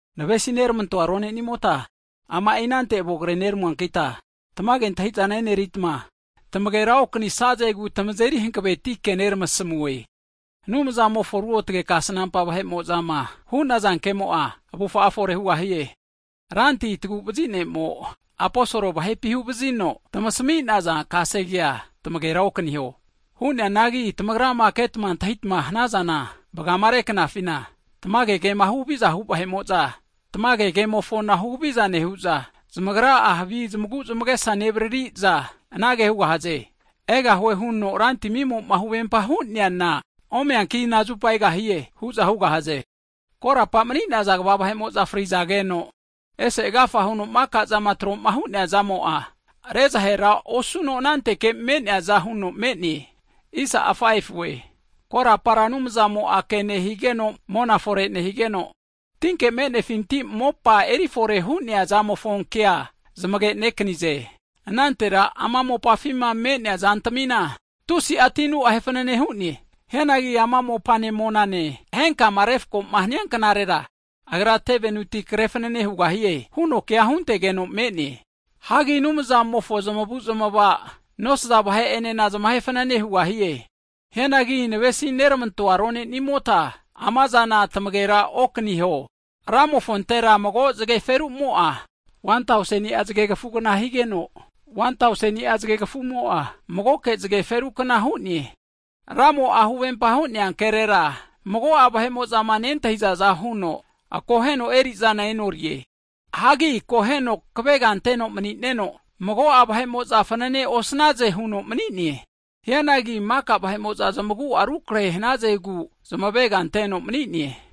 Navesi neramantoa rone'nimota, ama'i anante avo kreneramuankita tamage antahi'zana eneritma, tamagera okanisazegu tamazeri hanaveti ke neramasamue. Anumzamofo ruotge kasnampa vahe'mo'zama hu'naza ke'mo'a, avufa'a fore hugahie. Ranti Taguvazi Ne'mo aposol vahepi huvazino tamasami'nia kasegea tamagera okaniho. Hu'neanangi tamagrama ketma antahitama hanazana, vagama reknafina, tamage kema huhaviza hu vahe'mo'za, tamage kemofona huhaviza nehu'za, zamagra'a havi zmaguzmagesa nevaririza, anage hugahaze, Egahue huno Rantimimo'ma huvempama hu'neana, omeanki inazupa egahie? hu'za hugahaze. Korapa'ma mani'naza kva vahe'mo'za frizageno, ese agafa huno maka'zama troma hu'neazamo'a, zahera osuno anankante me'neaza huno me'ne. Korapara Anumzamo'a ke nehigeno mona fore nehigeno, tinke me'nefinti mopa eri fore hu'neazamofo kea zamage'nekanize. Anantera ama mopafima me'nea zantamina, tusi'a tinu ahe fanane hu'ne. Hianagi ama mopane monane henkama refko'ma hanianknarera Agra tevenuti kre fanane hugahue, huno kea huntegeno me'ne. Hagi Anumzamofo avu'ava'ma nosaza vahe'enena zamahe fanane hugahie. Hianagi navesi neramantoa ronenimota amazana tamagera okaniho, Ramofontera mago zage ferumo'a 1tauseni'a zagekfugna higeno, 1tauseni'a zagekafumo'a magoke zage ferukna hu'ne. Ramo'a huvempama hu'nea kerera, mago'a vahe'mo'zama nentahizaza huno akoheno eri'zana e'norie. Hagi akoheno kavega anteno mani'neno, mago'a vahe'mo'za fanane osnaze huno mani'ne. Hianagi maka vahe'mo'za zamagu'a rukrehe hanazegu zamavega anteno mani'ne.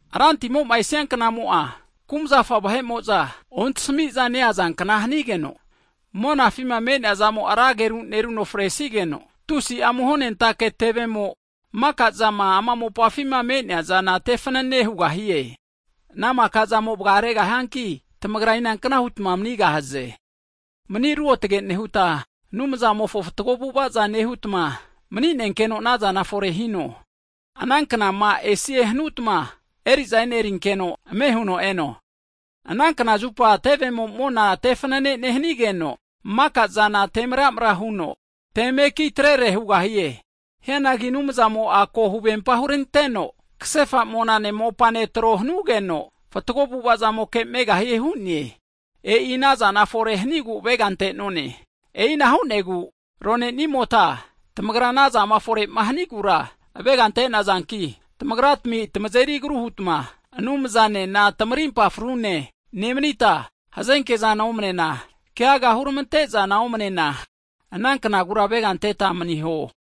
Rantimo'ma esianknamo'a kumzafa vahe'mo'za ontasmi'za neazankna hanigeno, monafima me'neazamo'a ra ageru neruno fanane hanigeno, tusi'a amuhonentake tevemo maka'zama ama mopafi me'neazana tefanane hugahie. E'inahu kante ana makazamo vagaregahianki, tamagra inankna hutma manigahze. Mani ruotge nehuta, Anumzamofo fatgo avu'avaza nehutma, mani'nenkeno anazana fore hino. Ananknama esie hanutma eri'za enerinkeno, ame huno eno. Anankna zupa tevemo mona te fanane nehanigeno, maka'zana te maramra huno, te mekitrere hugahie. Hianagi Anumzamo'a ko huvempa huranteno kasefa monane mopane tro hanugeno, fatgo avu'avazamoke megahie hu'ne. E'i anazama fore hanigu avega ante'none. E'ina hu'negu ronenimota, tamagra anazama fore'ma hanigura avega ante'nazanki, tamagratmia tamazeri agru hutma Anumzanena tamarimpa frune nemanita, hazenkezana omnena, keaga huramante'zana omnena, ananknagura avega anteta maniho.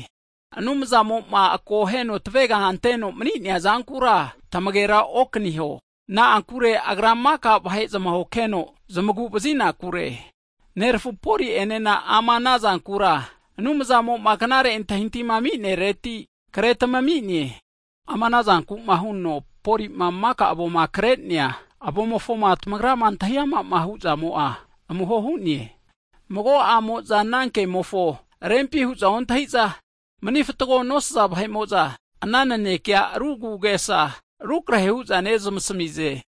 Anumzamo'ma akoheno tavega anteno mani'neazankura tamagera okaniho. Na'ankure Agra maka vahe zmahokeno zmagu vazinakure, nerafu Poli'enena ama anazankura Anumzamo'ma knare antahintahima aminereti kretamine. Ama anazanku'ma huno Polima maka avoma kre'nea avomofoma tagrama antahiama hu'zamo'a amuho hu'ne. Mago'amo'za ana kemofo rempi hu'za ontahi'za, manifatgo nosaza vahe'mo'za, ana nanekea ru agu'agesa rukrehe hu'za neramasamize.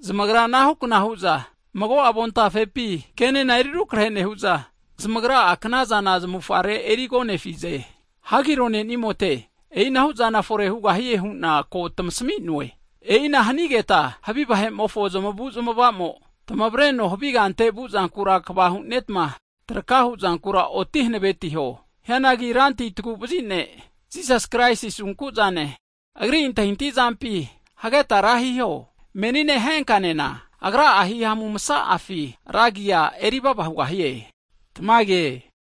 Zamagra anahukna hu'za mago'a avontafepi kenena erirukrehe nehu'za, zamagra'a kanazana zamavufare erigonefize. Hagi ronenimote, e'inahu'zana fore hugahie hu'na ko tamasami'noe! E'ina hanigeta havi vahe'mofo zamavu'zmava'zamo tamavareno havi kante vuzankura kva hu'netma, traka hu'zankura oti hanavetiho. Hianagi Ranti Taguvazi Ne' Jisasi Kraisi asunkuzane, Agri antahintahi zampi hageta ra hiho. Menine henkanena, Agra'a hihamu masa'afi ra agia erivava hugahie. Tamage.